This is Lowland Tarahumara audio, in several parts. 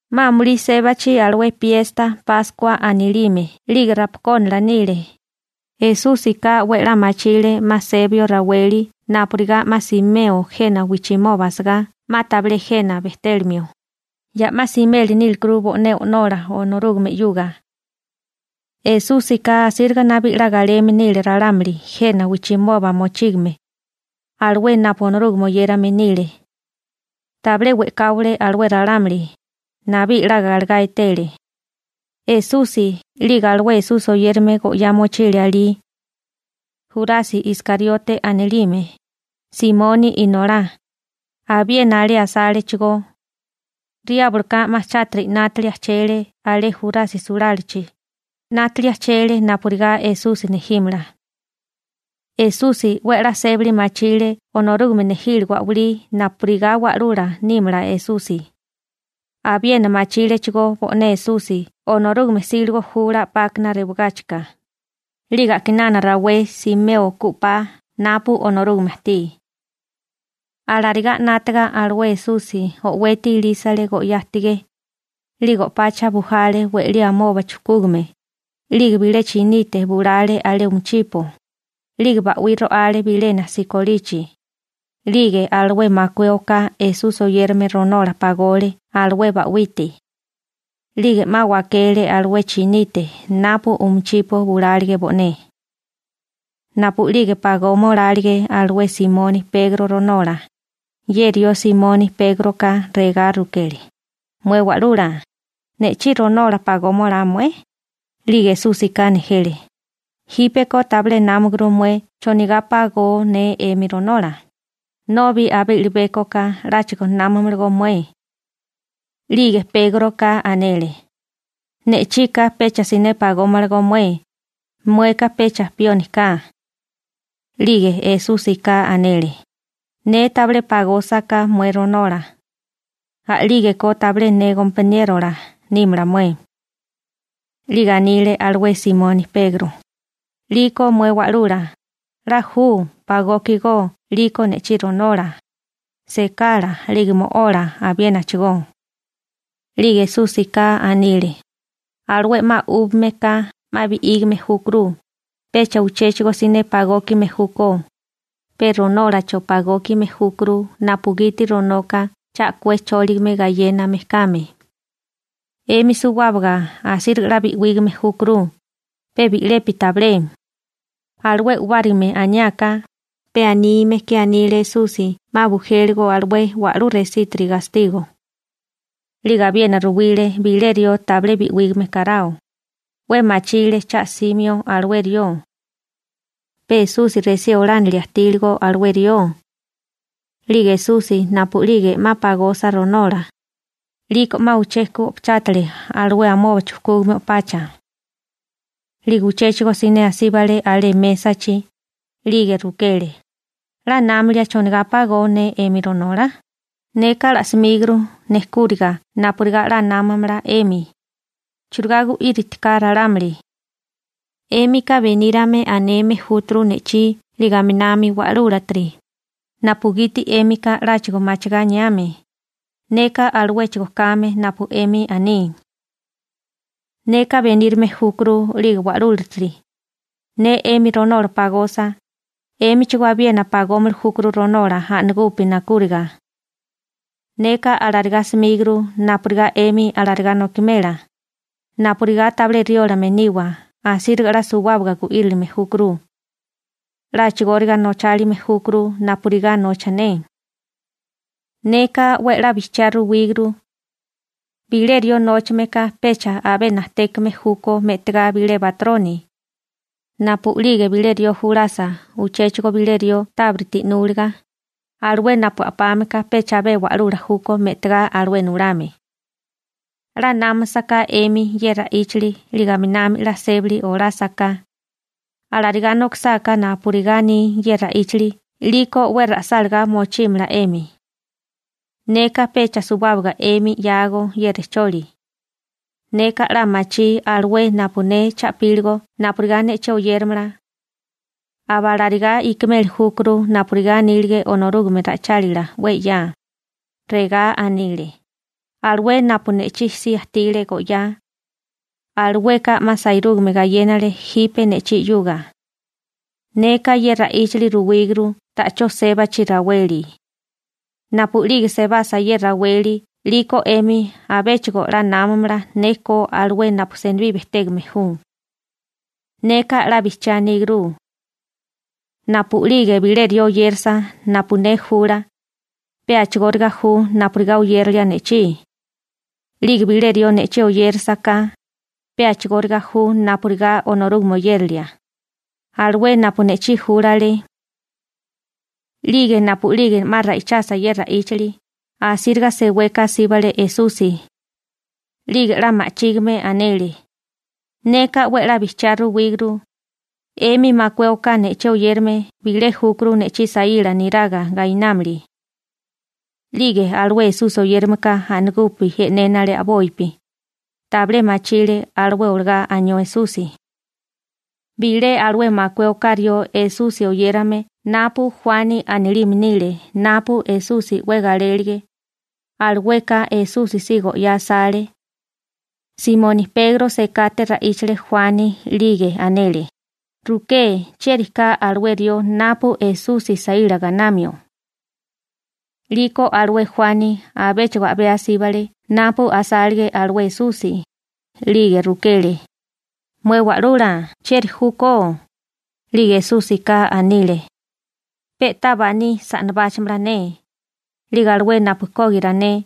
'Ma amulí sébachi alué piesta Páskua anilime 'lige rapakónala nile, Esúsika 'we a'lá machile 'ma sebio raweli napurigá 'ma simeo jena wijchimoba asagá 'ma tabilé jena bejtélimio, ya 'ma simeli nílekuru bo'né O'nola Onorúgame 'yuga. Esúsika asíriga nabí 'la galeme nile ralámuli jena wijchimoba mochígame, alué napu Onorúgame oyérame nile. Tabilé we'káwale alué ralámuli, nabí 'la galegá etele. Esusi 'lige alué Esusi oyérame go'yá mochile alí. Jurasi Iskariote anilime, Simoni inolá, abiena alé asálechigó. Riábloka 'ma chátiri 'nátili ajchele alé Jurasi sulálachi, 'nátili ajchele napurigá Esusi nejímala. Esusi 'we a'lá sébali machile Onorúgame nejíligo a'walí napurigá Wa'lula nímala Esusi. Abiena machílechigó bo'né Esusi Onorúgame 'síligo jula 'pákana rewagáchika, 'lige a'kinana rawé simeo ku 'pa napu Onorúgame ajtí. Alarigá 'nátaga alué Esusi o'weti ilísale go'yá ajtigé, 'lige o'pacha bujale we'lí amoba chujkúgame, 'lige bilé chinite bulale alé umichipo, 'lige ba'wí ro'ale bilena sikolichi. 'Lige alué makué oká Esusi oyérame ronola pagole alué ba'wite. 'Lige 'ma wakele alué chinite napu umichipo bulálige bo'né. Napu'lige pagoma olálige alué Simoni Pegro ronola, ye rió Simoni Pégroka regá rukele: ―Mué Wa'lula, ¿ne'chí ronola pagoma olá mué? 'Lige Esúsika nejele: ―Jípeko tabilé námaguru mué chonigá pagó ne 'emi ronola, nobi abé i'libékoka 'láchigo námamalagó mué. 'Lige Pégroka anele: ―Ne'chika pecha siné pagómalagó mué, mueka pecha pioni ka. 'Lige Esúsika anele: ―Ne tabilé pagósaká mué ronola, a'lígeko tabilé ne gompaniérola nímala mué. 'Lige anile alué Simoni Pegro: ―'Liko mué Wa'lula, 'la ju, pagókigó 'liko ne'chí ronola, sekala 'lige mo'ola abiénachigó. 'Lige Esúsika anile: ―Alué 'ma 'úbigame ka 'ma bi'ígame júkuru, pecha uchéchigo siné pagókime júkó, pe ronólacho pagókime júkuru napugiti ronoka cha a'kué chóligame gayéname kame. 'Emi suwábaga asíriga 'la bi'wígame júkuru, pe bi'lepi tabilé. Alué u'bárigame aniáká, pe anime ke anile Esusi 'ma bujéligo alué wa'lú resítiri gastigo. 'Lige abiena ruwile bilé rió tabilé bi'wígame karao, 'we machile cha 'simio alué rió. Pe Esusi resí olánilia ajtíligo alué rió. 'Lige Esusi napu'lige 'ma pagosa ronola, 'liko 'ma uché ku o'pachátale alué amoba chujkúgame o'pacha. 'Lige uchéchigo siné asíbale alé mésachi, 'lige rukele: ―¿'La námilia chonigá pagó ne 'emi ronola? Neka pagókuru mué ronola napurigá 'la námamala 'emi, churigá gu'íritika ralámuli. 'Émika benírame aneme júturu ne'chí 'lige aminami wa'lúlatiri, napugiti 'émika 'láchigo machigá aniame, neka aluéchigo kame napu 'emi aní. Neka benírame júkuru 'lige wa'lúlatiri. Ne 'emi ronola pagosa, 'émichigó abiena pagómili júkuru ronola a'nagupi nakúriga. Neka pagókuru mué ronola napurigá 'emi alarigá nokimela, napurigá tabilé riólame niwa asíriga 'la suwábaga gu'írilime júkuru. 'La a'chigóriga nochálime júkuru napurigá nocha ne. Neka 'we a'lá bijchiá ruwíguru. Bilé rió nóchame ka pecha abé najtékame júkó me'tigá bilé batroni. Napu'lige bilé rió julasa uchéchigo bilé rió tábiriti 'núliga, alué napu a'pame ka pecha abé wa'lula júkó me'tigá alué nulame. 'La námasaká 'emi ye ra'íchali 'lige aminami 'la sébali olásaká, alarigá nokisáká napurigá aní ye ra'íchali 'liko 'we ra'sálagá mochímala 'emi. › Neka pecha suwábaga 'emi 'yágó ye rejcholi. Neka 'la machí alué napu ne cha'píligo napurigá ne'chí oyéramala. Aba alarigá ikimeli júkuru napurigá anílige Onorúgame ra'ichálila 'we 'ya. Regá anile: «Alué napu ne'chí si ajtile go'yá, alueka 'ma sairúgame gayénale jipe ne'chí 'yuga.» Neka ye ra'íchali ruwíguru ta'chó sébachi raweli. Napu'lige sebasa ye raweli 'liko 'emi abéchigo 'la námamala ne ko alué napu senibí bejtégame ju. Neka 'la bijchiá aníguru. Napu'lige bilé rió oyérasa napu ne jula, pe a'chigóriga ju napurigá oyérilia ne'chí, 'lige bilé rió ne'chí oyérasaká, pe a'chigóriga ju napurigá Onorúgame oyérilia, alué napu ne'chí júlale. 'Lige napu'lige 'ma ra'ichasa ye ra'íchali, asíriga seweka asíbale Esusi. 'Lige 'la ma'chígime anele: ―Neka 'we a'lá bijchiá ruwíguru, 'emi makué oká ne'chí oyérame bilé júkuru ne'chí saíla niraga gainámili. 'Lige alué Esusi oyérameka a'nagupi e'nénale a'bopi, tabilé machile alué olagá anió Esusi. Bilé alué makué oká rió Esusi oyérame napu Juani anilime nile napu Esusi 'we galélige, alueka Esusi si go'yá asale. Simoni Pegro sekate ra'íchale Juani 'lige anele: ―Ruké chieri ka alué rió napu Esusi saíla gainamio. 'Liko alué Juani abéchigo a'bé asíbale napu asálige alué Esusi, 'lige rukele: ―Mué Wa'lula, ¿chieri júkó? 'Lige Esúsika anile: ―Pe'tá baní sa'nabáchamala ne, 'lige alué napu kógira ne,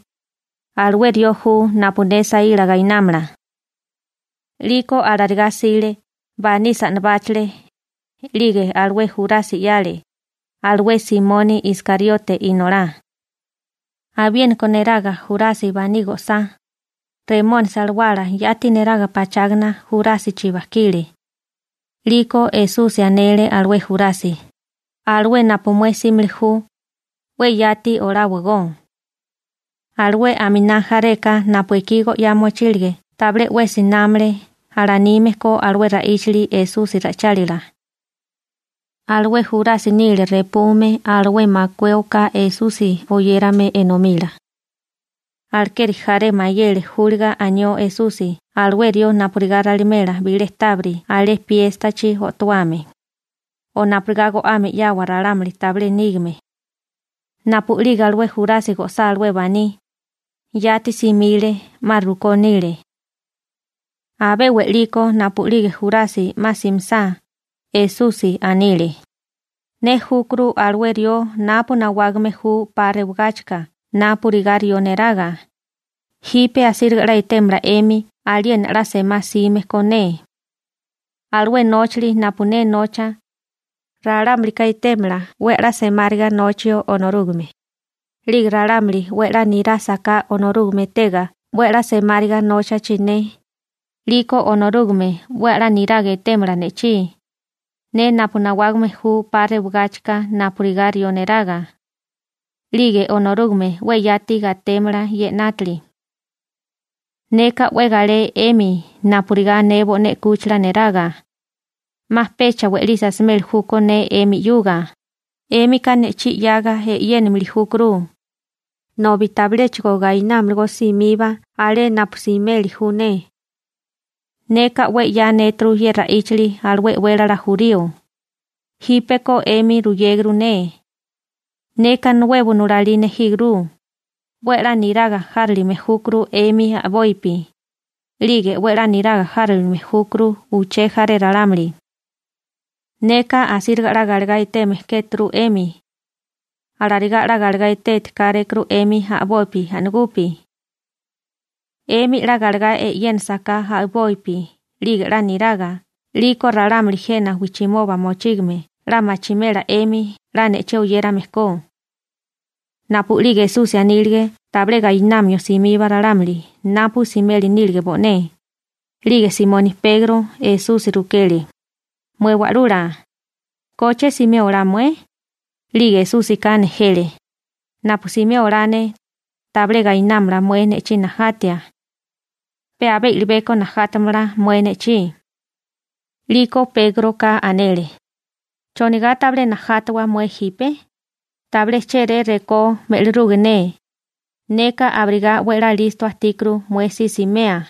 alué rió ju napu ne saíla gainámala. 'Liko alarigá 'sile, baní sa'nabáchale, 'lige alué Jurasi 'yale, alué Simoni Iskariote inolá. Abiéniko neraga Jurasi baní go'sá, Remónisi alawala yati neraga pachágana Jurásichi bajkile. 'Liko Esusi anele alué Jurasi: ―Alué napu mué 'símili ju, 'we yati oláwagó. Alué aminá jareka napu ekí go'yá mochílige tabilé 'wesi námale alanime ko alué ra'íchali Esusi ra'ichálila. Alué Jurasi nile repume alué makué oká Esusi oyérame enomila. Alekeri jaré mayele júliga anió Esusi alué rió napurigá ralimela bilé tábiri alé piéstachi o'towame, o napurigá go'ame 'yawa ralámuli tabilé nígame. Napu'lige alué Jurasi go'sá alué baní, yati simile. 'Ma rukó nile. Abé we'liko napu'lige Jurasi 'ma simisá, Esusi anile: ―Ne júkuru alué rió napu nawágame ju 'pa rewagáchika napurigá rió neraga, jipe asíriga 'la etémala 'emi aliena 'la semá 'sime ko ne. Alué nóchali napu ne nocha, ralámulika etémala 'we a'lá semáriga nochio Onorúgame. 'Lige ralámuli 'we a'lá nirásaká Onorúgame etega 'we a'lá semáriga nóchachi ne, 'liko Onorúgame 'we a'lá niraga etémala ne'chí, ne napu nawágame ju 'pa rewagáchika napurigá rió neraga. 'Lige Onorúgame 'we yati gatémala ye 'nátili. Neka 'we galé 'emi napurigá ne bo'né 'kúchila neraga. 'Ma pecha we'lisi asimeli júkó ne 'emi 'yuga. 'Émika ne'chí 'yaga e'yénimili júkuru, nobi tabiléchigo gainámalagó simiba alé napu simeli ju ne. Neka 'we 'ya anéturu ye ra'íchali alué e'wélala jurío, jípeko 'emi ruyéguru ne. Neka nuebo nulalí nejíguru: 'We a'lá niraga járilime júkuru 'emi a'bopi, 'lige 'we a'lá niraga járilime júkuru uché jaré ralámuli. Neka asíriga 'la galegá eteme kéturu 'emi. Alarigá 'la galegá eteti kárékuru 'emi a'boi a'nagupi. 'Emi 'la galegá e'yénasaká a'bopi 'lige 'la niraga 'liko ralámuli jena wijchimoba mochígame 'la machimela 'emi 'la ne'chí oyérame ko. Napu'lige Esusi anílige tabilé gainamio simiba ralámuli napu simeli nílige bo'né, 'lige Simoni Pegro Esusi rukele: ―Mué Wa'lula, ¿koche simé olá mué? 'Lige Esúsika nejele: ―Napu simé olá ne, tabilé gainámala mué ne'chí najatia. Pe abé i'libeko najátamala mué ne'chí. 'Liko Pégroka anele: ―¿Chonigá tabilé najátawa mué jipe? Tabilé chéré rekó me'liruge ne, neka abirigá 'we a'lá listo ajtíkuru mué si simea.